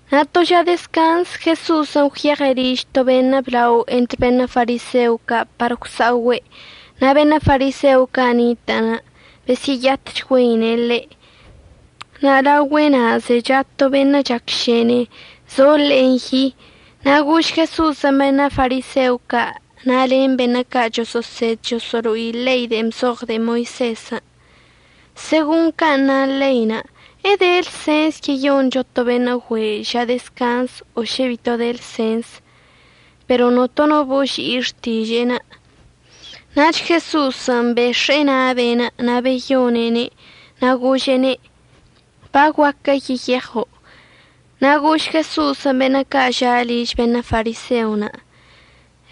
Na' to ža dezcanz Jeso'osən' gwyeɉe' liž to beṉə' blao entr beṉə' fariseo ca' par gwsa'ogüe', na' beṉə' fariseo ca' nitə'ənə' besyə'əyatchgüeine' ḻe'. Na' laogüe'enə' zecha to beṉə' chacšene, zo ḻe'enə' yi. Na' gož Jeso'osən' beṉə' fariseo ca' na' len beṉə' ca' choso'osed choso'olo'i ḻein' de'en bzoɉ de'e Moisezən': ―Segon can' na ḻein' ¿əde lsens yeyoncho to beṉə' güe' ža dezcanzən' o šə bito de lsens? Pero notono boži'i xtiže'enə'. Nach Jeso'osən' bex̱e'e na' be'enə' na' beyone'ene', na' gože'ene': ―Baguaquə yeyeɉo'. Na' gož Jeso'osən' beṉə' ca' ža' liž beṉə' fariseon':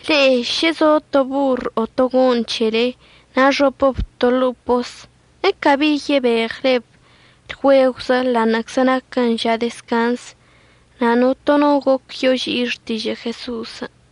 ―Le'e šə zo to borr o to go'oṉ c̱hele, na' əxopəb to ḻo'o pos, ¿əcabi yebeɉleb lgüegwzə ḻa'aṉə'əczə naquən ža dezcanz? Na' notono goc yoži'i xtižə' Jeso'osən'.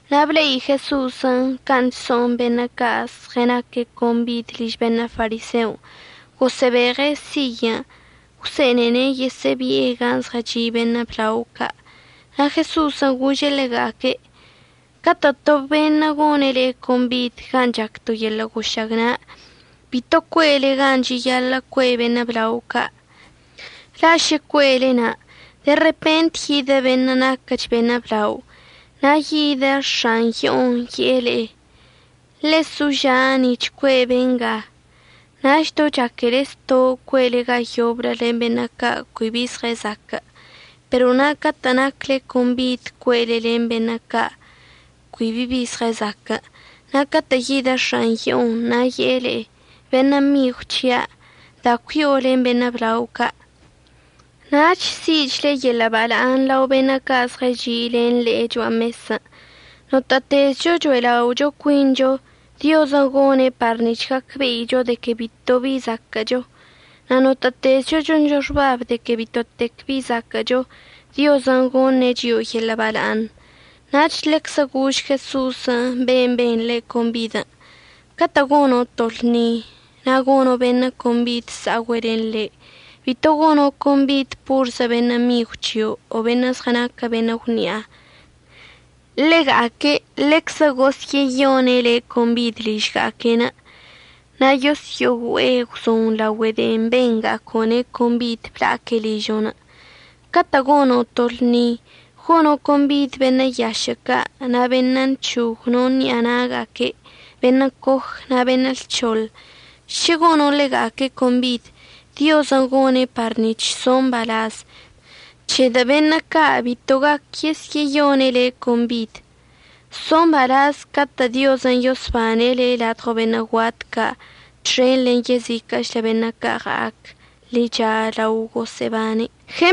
Na' ble'i Jeso'osən' can' chso'on beṉə' ca' zɉənaque' combid liž beṉə' fariseon', gosə'əbeɉe' siyən' gwse'enene' yesə'əbi'e gan' zɉəchi' beṉə' blao ca'. Na' Jeso'osən' gože' ḻega'aque': ―Catə' to beṉə' gone' le'e combid gan' chac to yeḻə' gošagna', bito cue'ele gan' cheyaḻə' cue' beṉə' blao ca'. La' šə cue'ele na' de repent yidə beṉə' naquəch beṉə' blao. Na' yidə x̱an yo'onə' ye'e le'e: “Ḻesoža' nic̱h cue' benga.” Nach do chaquele zto' cue'ele ga yoblə len beṉə' ca' cui bi bi zɉəzaquə'. Pero na' catə' nacle combid, cue'ele len beṉə' ca' cui bi bi zɉəzaquə', na' catə' yidə x̱an yo'onə' na' ye'e le'e: “Beṉə' migw c̱hia', da cui'o len beṉə' blao ca'”, nach si'ichle yeḻə' bala'aṉ lao beṉə' ca' zɉəchi' len le'e cho'a mesən'. Notə'ətezcho cho'elao' cuincho, Diozən' gone' par nic̱h gacbe'icho de que bitobi zaquə'əcho. Na' notə'ətezcho choncho xbab de que bitotec bi zaquə'əcho, Diozən' goṉe' chio'o yeḻə' bala'aṉ. Nach ḻeczə gož Jeso'osən' ben' ben ḻe' combid: ―Catə' gono' to lṉi na' gono' beṉə' combid əsa'ogüe' len le', bito gono' combid porzə beṉə' migw c̱hio' o beṉə' zɉənaquə beṉə' gwni'a. Ḻega'aque' ḻeczə gosyə'əyone' le' combid ližga'aque', na' yosyo'ogüe'e gwzon laogüe de'en benga'aco'one' combidən' bla'aque' ližo'onə'. Catə' gono' to lṉi, gono' combid beṉə' yašə' ca' na' beṉə' nchog no ṉi'a na'aga'aque', beṉə' coj, na' beṉə' lc̱hoḻ. Šə gono' ḻega'aque' combid, Diozən' gone' par nic̱h so' mbalaz, c̱hedə' beṉə' ca' bito gaquə yesyə'əyone' le' combid. So' mbalaz catə' Diozən' yosbane' le' ladɉo beṉə' guat ca' txen len yeziquə'əchlə beṉə' ca' ɉa'ac ḻicha lao gosə'əbane'.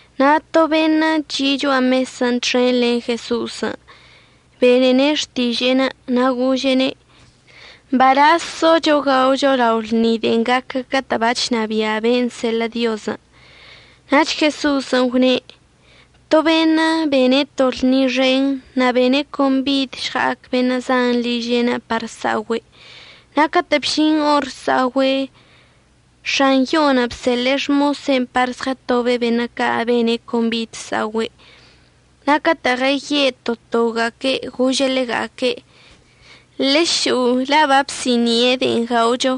Na' to beṉə' chi' cho'a mesən' txen len Jeso'osən' benene' xtiže'enə' na' gože'ene': ―Mbalaz socho gaocho lao lṉi de'en gaquə catə' bachnabia' ben' əseḻə' Diozən'. Nach Jeso'osən' gwne': ―To beṉə' bene' to lṉi xen na' bene' combid əžɉa'ac beṉə' zan liže'enə' par əsa'ogüe'. Na' catə' bžin or əsa'ogüe', x̱an yo'onə' bseḻe'e xmose'enə' par žɉətobe' beṉə' ca' bene' combid əsa'ogüe'. Na' catə' ɉəye' to toga'aque' gože' ḻega'aque': “Ḻešo'o, la' babsi'ini'e de'en gaocho.”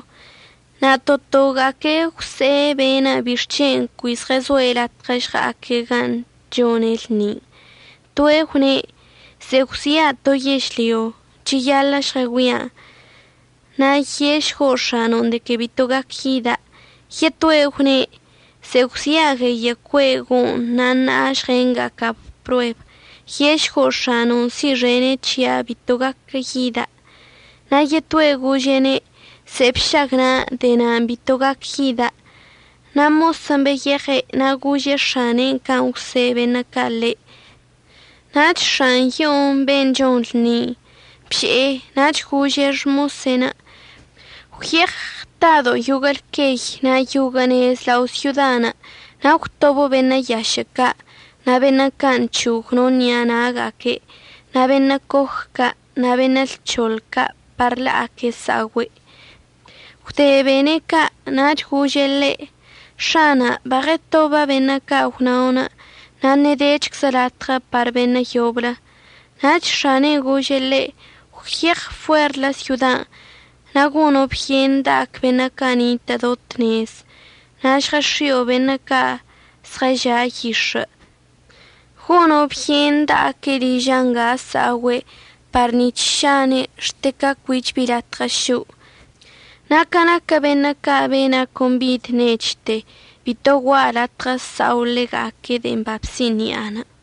Na' to toga'aque' gwse'e be'enə' bixc̱hen' cui zɉəzoe' latɉə žɉa'aque' gan' chone' lṉin'. Toe' gwne': “Ze'e gwxi'a to yežlyo. Cheyaḻə' žɉəgüia'an. Na' ye'ešgo' x̱ano'on de que bito gac yida'.” Yetoe' gwne': “Ze'e gwxi'a gueyə' cue' go'oṉ na' ṉa'a əžɉenga'aca'ab prueb. Ye'ešgo' x̱ano'on si'ixene' c̱hia' bito gaquə yida'.” Na' yetoe' gože'ene': “Ze'e bšagna'a. De'e na'anə' bito gaquə yida'.” Na' mosən' beyeɉe' na' gože' x̱ane'enə' can' gwse' beṉə' ca' ḻe'. Nach x̱an yo'onə' ben' chon lṉin' bže'e, nach gože' xmose'enə': “Gwyeɉ ɉtado' yoguə' lqueyən' na' yoguə' nez lao' syodan', na' əgwtobo' beṉə' yašə' ca' na' beṉə' ca' nchog no ṉi'a na'aga'aque', na' beṉə' coj ca' na' beṉə' lc̱hoḻ ca' par la'aque' əsa'ogüe'.” Gwde bene' ca' nach gože' ḻe': “X̱ana', baɉətoba' beṉə' ca' gwna'onə' na' ṉedechczə latɉə par beṉə' yoblə.” Nach x̱ane'enə' gože' ḻe': “Gwyeɉ fuer syodan' na' gono' byen da'ac beṉə' ca' nitə' do tnezən' na' žɉəx̱i'o beṉə' ca' zɉəža' yix̱ə', gono' byen da'aque' liža' nga əsa'ogüe' par nic̱h šane' xte ca cuich bi latɉə šo'. Na' ca naquə beṉə' ca' bena' combid nechte, bito gua'a latɉə əsa'o ḻega'aque' de'en babsi'ini'anə'.”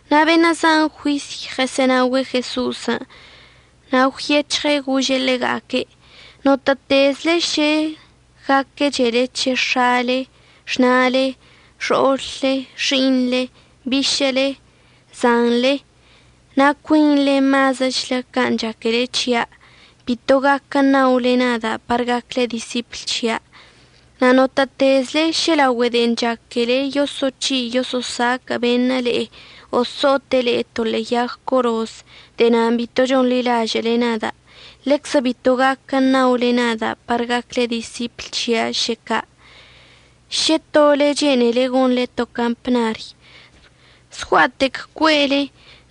Na' beṉə' zan juisy ɉəsə'ənaogüe' Jeso'osən'. Na' gwyec̱hɉe' gože' ḻega'aque': ―Notə'ətezle šə gaquəchele c̱he x̱ale, xna'ale, xo'olle, xi'iṉle, bišə'əle, zanḻe na' cuinḻe mazəchlə can' chaquele c̱hia', bito gaquə ṉaole nada' par gacle disipl c̱hia'. Na' notə'ətezle šə laogüe de'en chaquele yoso'oc̱hi' yoso'osaquə' beṉə' le'e o so'ote' le'e to ḻe'e yag coroz de'e nan' bito chonḻilažə'əle nada', ḻeczə bito gaquə ṉaole nada' par gacle disipl c̱hia' šə ca'. Šə to le'e chene'ele gonḻe to campnary, zgua'atec cue'ele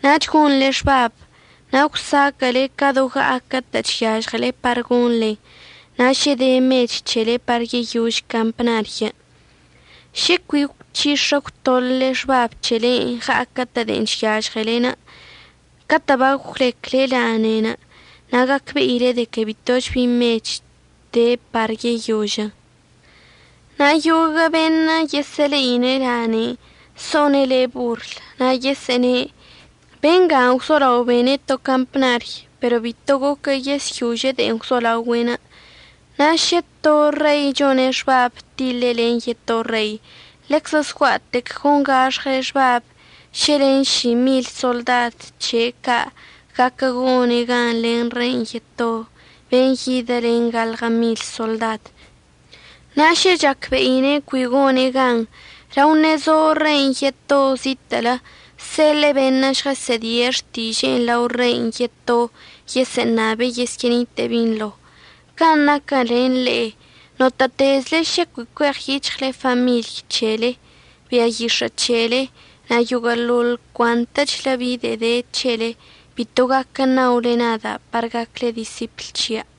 nach gonḻe xbab na' gwzaquə'əle ca do ɉa'aquə'ətə' chyažɉele par gonḻen na' šə de mech c̱helenə' par yeyož campnaryən'. Šə cui əgwchix̱ə əgwtoḻə' xbab c̱helen' ɉa'aquə'ətə' de'en chyažɉele, catə' bagwlecle laneinə' na' gacbe'ile de que bitoch bi mech de par yeyožən. Na' yoguə' beṉə' yesə'əle'i lanein' so'one' le'e borl. Na' yesə'əne': “Benga gwzolao bene' to campnary pero bito goquə yesyože' de'en gwzolaogüe'.” Na' šə to rei chone' xbab tiḻe' len yeto rei ḻeczə zgua'atec gongax̱ɉe' xbab šə len si mil soḻdad c̱he' ca' guaquə gone' gan len rein' yeto ben' yidə len gaḻɉə mil soḻdad. Na' šə chacbe'ine' cui gone' gan, lao ṉezo rein' yeto zitə'ələ, əseḻe'e beṉə' žɉəsə'ədie' xtiže'en lao rein' yeto yesə'əṉabe' yesyə'ənite'e binḻo. Can' naquən len le'e, notə'ətezle šə cui cueɉyic̱hɉle famiḻy c̱hele, bia yix̱ə' c̱hele na' yoguə'əḻoḻ cuantəchlə bi de'e de c̱hele, bito gaquə ṉaole nada' par gacle disipl c̱hia'.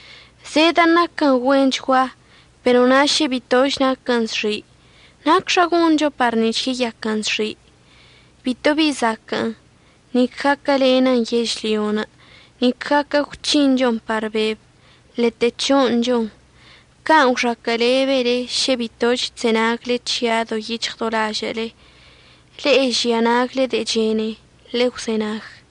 Zedə'ən naquən güenchgua, pero na' šə bitoch naquən zxi', ¿nacxa goncho par nic̱h yeyaquən zxi'? Bitobi zaquə'ən, nic gaquəlenən yežlyon', nic gaquə gwc̱hinchon par beb, ḻete c̱ho'oṉchon. Can' gwxaquə'əlebele šə bitoch chzenagle c̱hia' do yic̱hɉ do lažə'əle. Le'e žia nagle de'e chene, ḻegwzenag.